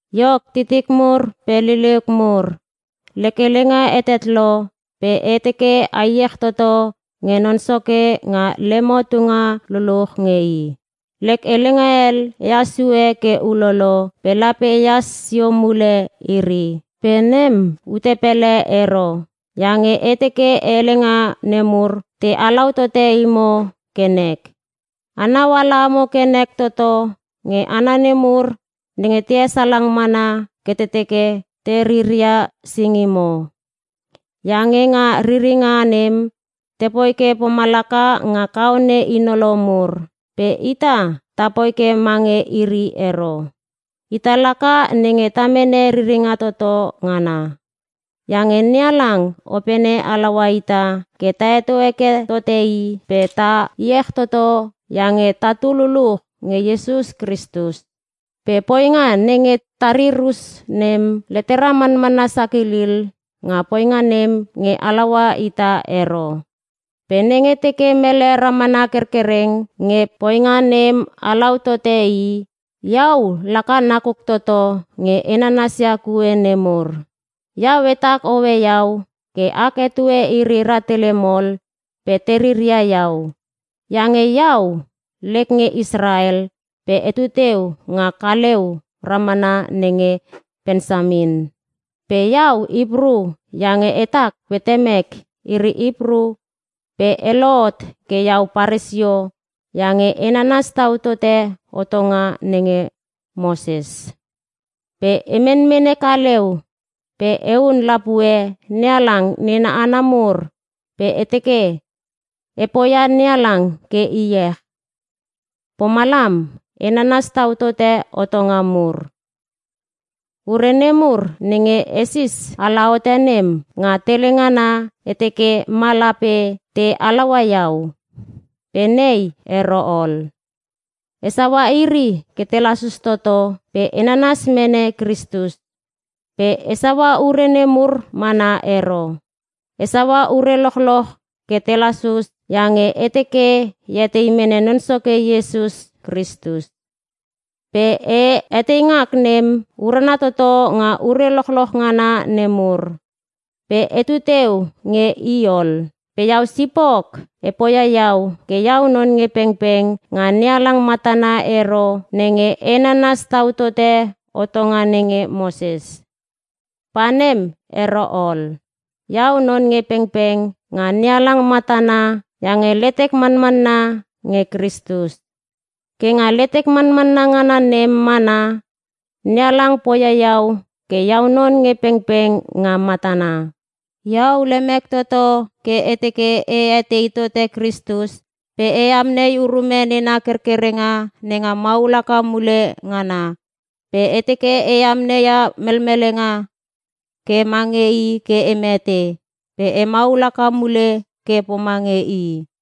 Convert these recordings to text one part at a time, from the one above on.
Iok titik mur pe liliuk mur, lek helenga hetet lo pe e teke a iech toto nge Non Soke nga lemo tunga luluch nge I. Lek helenga hel ehas sue ke ulolo pe lape ehas sio mule iri. Pe nem, ute pele ero. Iange e teke helenga nemur te halau tote imo ke nek. Anau ala amo ke nek toto nge hana nemur nenge te hesalang mana ke te teke te riria singimo. Iange nga riringa nem, te poi ke pomalaka nga kaone hinolo mur. Pe ita, ta poi ke mange iri ero. Ita laka nenge ta mene riringa toto ngana. Iange NeHalang opene halaua ita ke ta heto heke tote I pe ta iech toto iange tatu luluch nge Iesus Kristus. Pe poinga nenge ta rir us nem, letera manmanna sakilil nga poinga nem nge halaua ita ero. Pe nenge teke mele ramana kerkereng nge poinga nem halaua tote i, iau laka nakuk toto nge e nanasia kue nemur. Iau etak hoe iau ke ak etue iri rahtele mol pe te riria iau. Iange iau, lek nge Israel pe etu teu nga kaleu ramana nenge Pensamin. Pe iau Hipru iange hetak pe temek iri Hipru pe e lohot ke iau paresio iange e nanas tau tote hotonga nenge Moses. Pe e menmene kaleu pe e hun lapue NeHalang nena hana mur pe e teke e poia NeHalang ke iech, pomalam e nanas tau tote hotonga mur. Ure nemur nenge esis ala hote nem, nga tele ngana e teke ma lape te halaua iau. Pe nei ero ol. E saua iri ke te lasus toto pe e nanas mene Kristus. Pe e saua ure nemur mana ero. E saua ure lochloch ke te lasus iange e teke e etei mene Non Soke Iesus Kristus. Pe e eteingak nem urana toto nga ure lochloch ngana nemur. Pe etu teu nge I ol. Pe iau sipok e poia iau ke iau non nge pengpeng nga NeHalang matana ero nenge e nanas tau tote hotonga nenge Moses. Pa nem ero ol. Iau non nge pengpeng nga NeHalang matana iange letek manmanna nge Kristus. Ke nga letek manmanna ngana nem mana, NeHalang poia iau ke iau non nge pengpeng nga matana. Iau lemek toto ke e teke e etei tote Kristus pe e amnei urume nena kerkerenga nenga maul haka mule ngana. Pe e teke e amneia melmelenga ke mange i ke e mete pe e maul haka mule ke pomange I.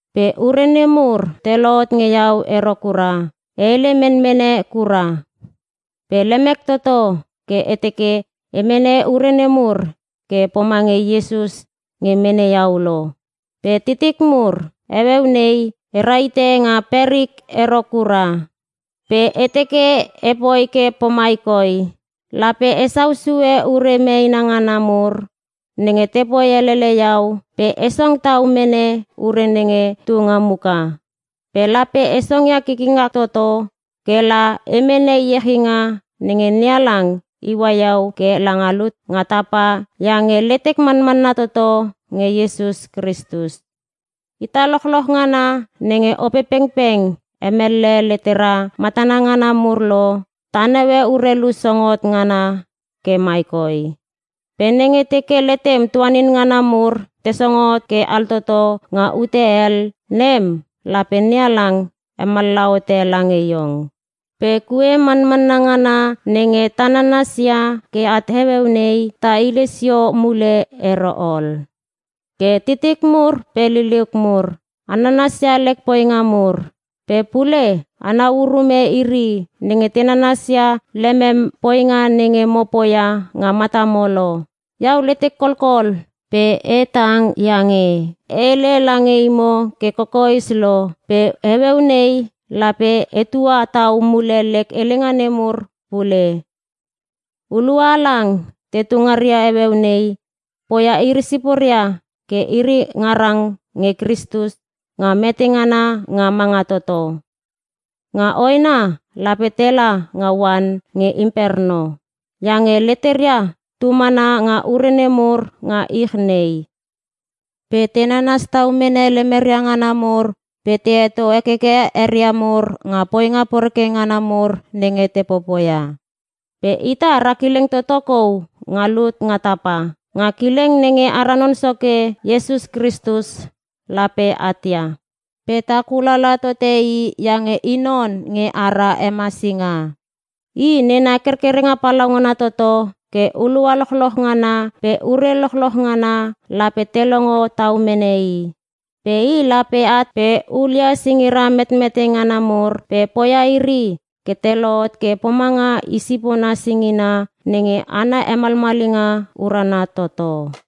Pe ure nemur te lohot nge iau ero kura. E hele menmene kura. Pe lemek toto ke e teke e mene ure nemur ke pomange Iesus nge mene iau lo. Pe titik mur, heueu nei e rahite nga perik ero kura. Pe e teke epoi ke pomai koi: Lape esau sue ure meena ngana mur nenge te poi helele iau pe e song tau mene ure nenge tu nga muka. Pe lape e songia kikikngak toto ke la e mene iechinga nenge NeHalang iua iau ke ela nga lut nga tapa iange letek manmanna toto nge Iesus Kristus. Ita lochloch ngana nenge Opepengpeng hemellehe letera matana ngana mur lo, ta naue urelu song hot ngana ke mai koi. Pe nenge teke letem tuanin ngana mur te song hot ke altoto nga ute hel, nem lape NeHalang hemallaha hote lange iong. Pe kue manmanna ngana nenge ta nananas ia ke at heueu nei, ta hile sio mule ero ol. Ke titik mur pe liliuk mur, a nanas ia lek poinga mur. Pe pule anau urume iri nenge te nanasia lemem poinga nenge mo poia nga matamo lo. Iau letek kolkol pe e tang iange e hele lange imo ke kokoes lo, pe heueu nei lape etua tau mule lek helenga nemur pule: Hulua halang tetu ngaria heueu nei, poia iri siporia ke iri ngarang nge Kristus nga mete ngana nga manga toto. Nga hoena lape tela nga oan nge imperno. Iange leteria tu mana nga ure nemur nga ich nei. Pe te nanas tau mene lemeria ngana mur pe te heto hekeke eria mur nga poinga poreke ngana mur nenge te popoia. Pe ita ra kileng toto kou nga lut nga tapa. Nga kileng nenge ara Non Soke Iesus Kristus lape at ia. Pe ta kulala tote I iange I non nge ara hemasinga. I, nena kerkerenga palaungana toto ke hulua lochloch ngana pe ure lochloch ngana lape te longo tau mene I. Pe I lape at pe hulia singira metmete ngana mur pe poia iri ke te lohot ke pomanga I sipona singina nenge ana hemalmalinga urana toto.